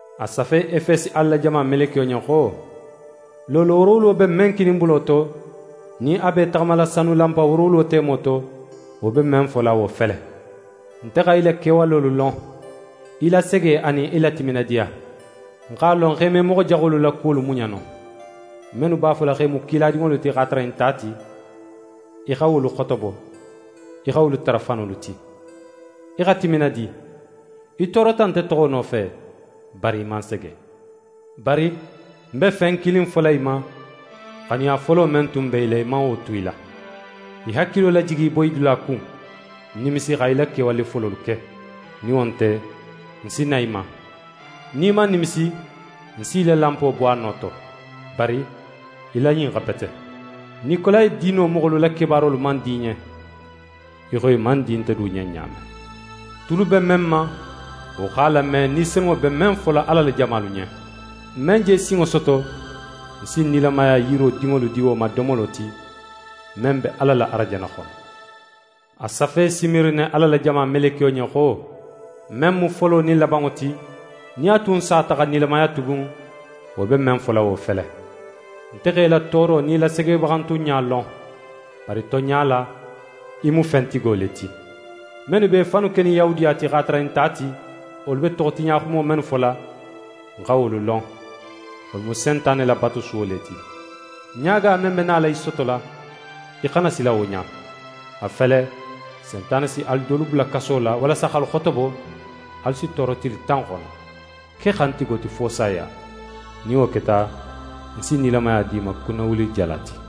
«A safe Efesi Ala la jama melekiyo ɲen xo: «Loolo woorowulo be men kininbulo to, nin a be í taxamala sanu lanpa woorowulo temo to, wo be men fola wo fele: Nte xa í la kewalolu lon, í la sege anin í la timinadiya. Ń x'a lon xo í me moxo jaxolu la kuwolu muɲa no. Mennu b'a fola x'e mu kiladinŋolu ti x'a tara i nte a ti, í xa wolu xotobo, í xa wolu tara fanolu ti. Í xa timinadi, í toorota nte toxo nofe, bari í man sege. Bari ń be fen kilin fola í ma, xanuya folo men tun be í la, í man wo tu í la. Í hakilo lajigi í boyidula kun, nimisi xa í la kewale fololu ke, nin wo nte, ń si na í ma. Nin í man nimisi, ń si í la lanpo bo a no to. Bari í la ɲin xa bete: Nikolayi diino moxolu la kebaarolu man di í ɲen, í xo i man di nte du ɲen ɲa men. «Tulu be men ma, wo x'a lame, Ni Senunŋo be men fola Ala la jamalu ɲen. «Men je sinŋo soto, ń si nilamaya yiro dinŋolu di wo ma domolo ti, men be Ala la arajanna xono.» «A safe Simirine Ala la jama melekiyo ɲen xo: «Men mu folo nin labanŋo ti, nin a tun sata xa nilamaya tugun, wo be men fola wo fele: Nte x'é la tooro nin í la segebaxantunɲa lon. Bari tonɲa la, í mu fentigo le ti! Mennu be i fannu kenin Yahudiya ti, x'a tara i nte a ti, wolu be toxotiɲaxumo mennu fola, ń xa wolu lon. Wolu mu Sentane la batusuwo le ti. Ɲaaga men be nala í sotola, í xana sila wo ɲa. A fele, Sentane si alu dolu bula kaso la walasa x'alu xotobo, alu si tooro tili tan xono. Ke xantigo ti fo saya. Nin wo keta, ń si nilamaya di í ma kunnawulijala ti.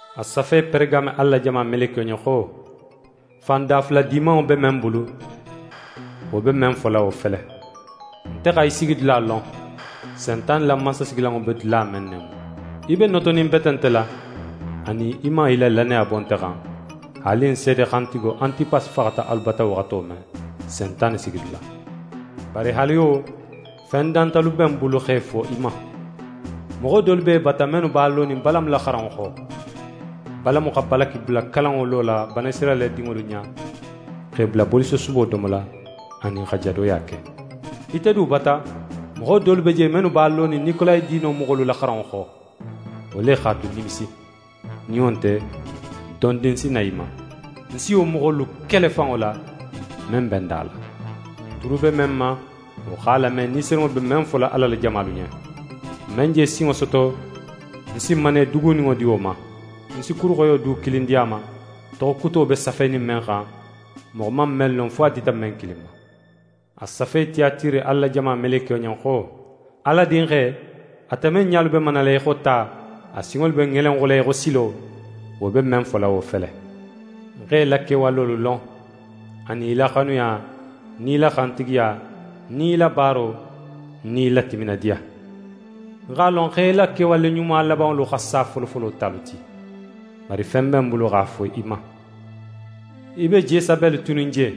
«A safe Peregame Ala la jama melekiyo ɲen xo: «Fan dafula dimanŋo be men bulu, wo be men fola wo fele: Nte xa í sigidula lon: Sentane la mansasigilanŋo be dula men ne mu. Í be notoninbete nte la, anin í man í la lannaya bo nte xan, haali ń seede xantigo, Antipasi faxata alu bata waxato men, Sentane sigidula. Bari haali wo, fen dantalu be ń bulu x'e fo í ma: Moxo dolu be í bata mennu b'a lonin Balamu la xaranŋo xo. Balamu xa Balaki bula kalanŋo lola Banisirayila dinŋolu ɲa x'e bula bolisosubo domola anin xa jadoya ke. Ite du bata, moxo dolu be je, mennu be a lonin Nikolayi diino moxolu la xaranŋo xo. Wo le x'a tu, nimisi. Nin wo nte, dondin ń si na í ma, ń si wo moxolu kele fanŋo la, men be ń da la. «Tulu be men ma, wo x'a lame, Ni Senunŋo be men fola Ala la jamalu ɲen! «Men je sinŋo soto, ń si manne duguninŋo di wo ma. Ń si kuru xoyo du kilin di a ma, toxo kuto be safenin men xan, moxo man men lon fo a dita men kilin ma.» «A safe Tiyatire Ala la jama melekiyo ɲen xo: «Ala Dinxe, ate men ɲalu be manala í xo ta, a sinŋolu be ŋelenxula í xo silo, wo be men fola wo fele: Ń x'é la kewalolu lon, anin í la xanuya, nin í la xantigiya, nin í la baaro, nin í la timinadiya. Ń x'a lon x'é la kewale ɲuma labanŋolu xa sa folofolo talu ti. Bari fen be ń bulu x'a fo í ma: Í be Jesabeli tunin je,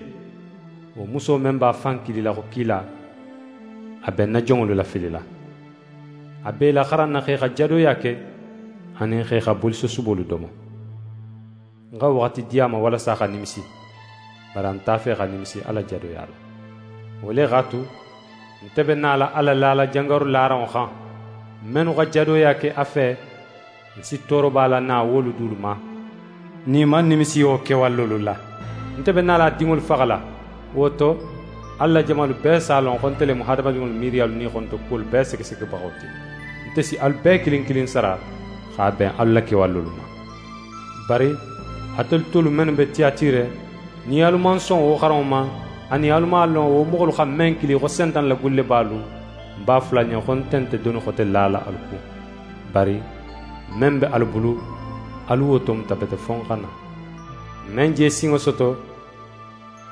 wo muso men b'a fan kilila xo kila, a be ń na jonŋolu lafilila. A b'e laxaranna x'e xa jadoya ke anin x'e xa bolisosubolu domo. Ń xa waxati di a ma walasa a xa nimisi, bari a nte a fe xa nimisi a la jadoya la. Wo le x'a tu, nte be nala a lalala jangaru laranŋo xan. Mennu xa jadoya ke a fe, ń si tooroba lana wolu dulu ma, nin i man nimisi wo kewalolu la. Nte be nala a dinŋolu faxala. Wo to, Ala la jamalu bee si a lon xo nte le mu hadamadinŋolu miiriyalu nin i xonoto kuwolu bee segesegebaxo ti. Nte si alu bee kilin kilin sara x'a ben alu la kewalolu ma. «Bari atelu tolu mennu be Tiyatire, nin alu man son wo xaranŋo ma, anin alu man a lon wo moxolu xa men kili xo “Sentane la gullebalu”, ń b'a fola alu ɲen xo, nte nte doni xote lala alu kun. Bari men be alu bulu, alu wo tomuta bete fo ń xa na. «Men je sinŋo soto,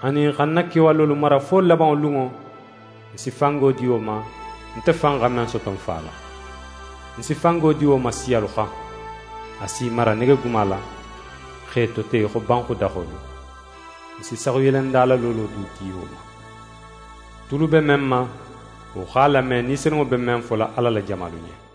anin xa ń na kewalolu mara fo labanŋo lunŋo, ń si fango di wo ma, nte fan xa men soto ń Fa la: Ń si fango di wo ma siyalu xan. A si i mara negeguma la, x'e tote í xo banxudaxolu. Ń si saxuyelendala loolo du di wo ma. «Tulu be men ma, wo x'a lame, Ni Senunŋo be men fola Ala la jamalu ɲen!»